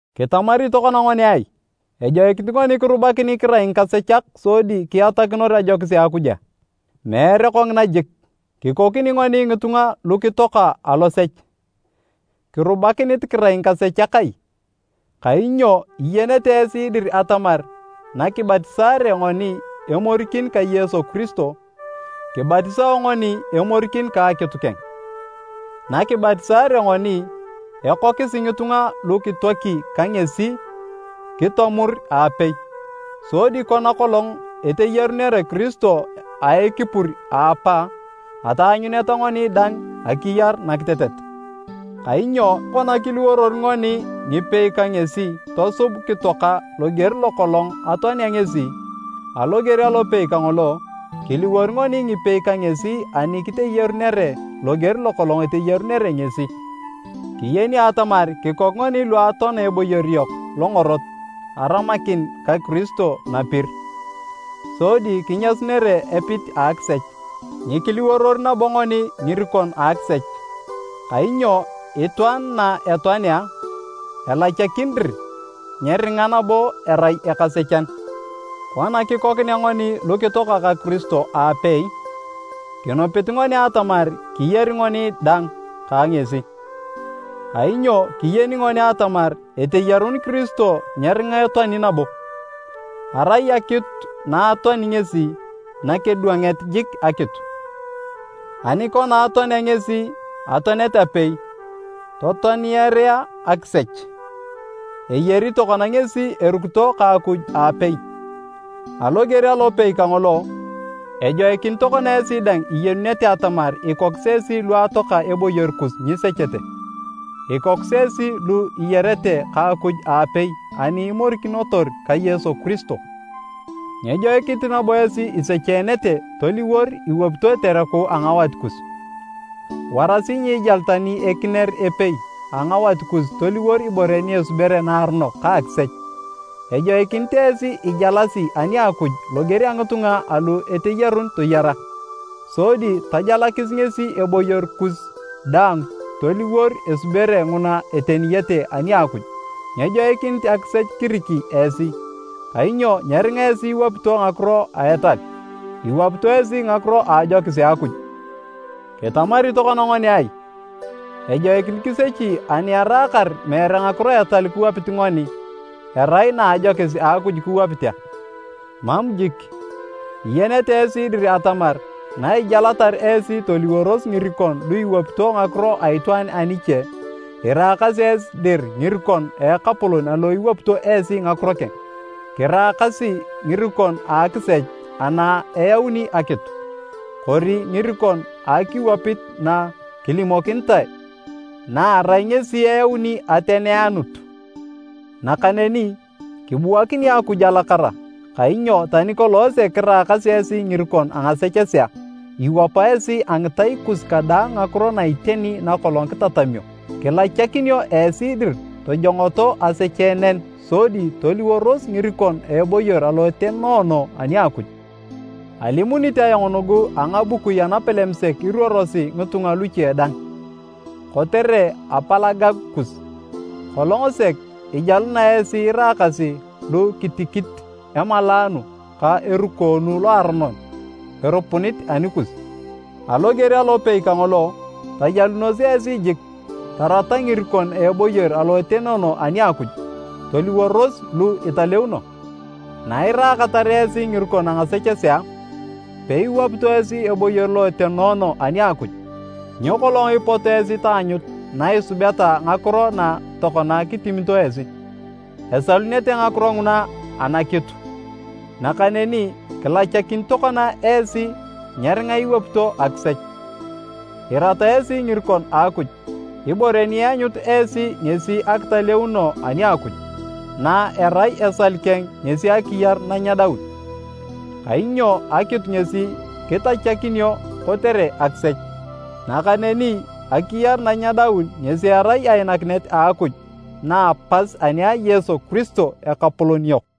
Kitamari tokona ngoni ai? Ejoikinit ngoni kirubakini kirai ngikasechak sodi kiatakinor ajokis a Akuj a? Meere kongina jik! Kikoni ngoni ngitunga lu kitoaka alosech, kirubakinit kirai ngikasechak ai? Kainyo iyenete esi dir atamar nakibatisaare ngoni emorikin ka Yesu Kiristo, kibatisao ngoni emorikin ka akitu keng. Na kibatisaare ngoni, ekokisi ngitunga lu kitoaki ka ngesi kitomur aapei. Sodi kona kolong eteyarunere Kiristo a ekipur a Apa, ataanyuneta ngoni dang akiyar nakitetet. Kainyo kona kiliworor ngoni ngipei ka ngesi tosub kitoaka loger lokolong atoanea ngesi, aloger alopei kangolo, kiliwor ngoni ngipei ka ngesi ani kiteyarunere loger lokolong eteyarunere ngesi. Kiyeni atamar kikok ngoni lu atoana eboyor yok longorot aramakin ka Kiristo napir, sodi kinyasunere epit a akisech, nyikiliworor nabo ngoni ngirikon a akisech. Kainyo itwaan na etoanea, elachakin dir nyeringa nabo erai ekasechan. Kona kikokinea ngoni lu kitoaka ka Kiristo aapei. Kinupit ngoni atamar kiyari ngoni dang ka ngesi. Kainyo kiyeni ngoni atamar eteyarun Kiristo nyeringa etoani nabo, arai akitu na atoani ngesi, nakidwanget jik akitu. Ani kona atoanea ngesi atoanet apei totoaniarea akisech, eyari tokona ngesi erukito ka Akuj aapei. Aloger alopei kangolo, ejoikinit tokona esi dang iyenunete atamar ikokis esi lu atoaka eboyor kus nyisechete. Ikokis esi lu iyarete ka Akuj aapei ani imorikinotor ka Yesu Kiristo. Nyejoikinit nabo esi isecheenete toliwor iwapito etereku a ngawat kus. Warasi nyiijal tani ekinier epei a ngawat kus toliwor ibore ni esubere naaronok ka akisech. Ejoikinit esi ijalasi ani a Akuj loger a ngitunga alu eteyarun toyara, sodi tajalakis ngesi eboyor kus daang toliwor esubere nguna eteniyete ani a Akuj. Nyejoikinit akisech kiriki esi, kainyo nyeringa esi iwapito ngakiro a etal, iwapito esi ngakiro a ajokis a Akuj. Kitamari tokona ngoni ai? Ejoikinit kisechi ani eraakar meere ngakiro a etal kiwapit ngoni, erai na a ajokis a Akuj kiwapit a? Mam jik! Iyenete esi dir atamar na ijalatar esi toliworos ngirikon lu iwapito ngakiro a itwaan aniche, iraakasi esi dir ngirikon a ekapolon alo iwapito esi ngakiro keng, kiraakasi ngirikon a akisech ana eyauni akitu, kori ngirikon a akiwapit na kilimokinitae, na erai ngesi eyauni ateneanut. Nakaneni, kibuakini Akuj alakara! Kainyo tani kolong sek kiraakasi esi ngirikon a ngasechesea, iwapa esi a ngitai kus kadaang ngakiro na iteni nakolong kitatamio. Kilachakinio esi dir tojongoto asecheenen sodi toliworos ngirikon a eboyor alo etenoono ani a Akuj. ( Alimunit ayong nugu a ngabukui anapalem sek iruorosi ngitunga luche dang, kotere apalagagu kus.) Kolong sek ijaluna esi iraakasi lu kitikit emalaanu ka erukoonu loaronon erupunit anikus. Aloger alopei kangolo, tajalunos esi jik tarata ngirikon a eboyor alo etenoono ani a Akuj, toliworos lu italeuno. Nairaakatar esi ngirikon a ngasechesea, peiwapito esi eboyor lo etenoono ani a Akuj. Nyo kolong ipot esi taanyut na isubeta ngakiro na tokona kitimito esi? Esalunete ngakiro nguna anakitu! Nakaneni kilachakin tokona esi nyeringa iwapito akisech, irata esi ngirikon a Akuj. Ibore ni ianyut esi ngesi akitaleuno ani a Akuj, na erai esal keng ngesi akiyar nanyedaun. Kainyo akitu ngesi kitachakinio kotere akisech, nakaneni akiyar nanyedaun ngesi erai ainakinet a Akuj na a pas ani a Yesu Kiristo, Ekapolon yok.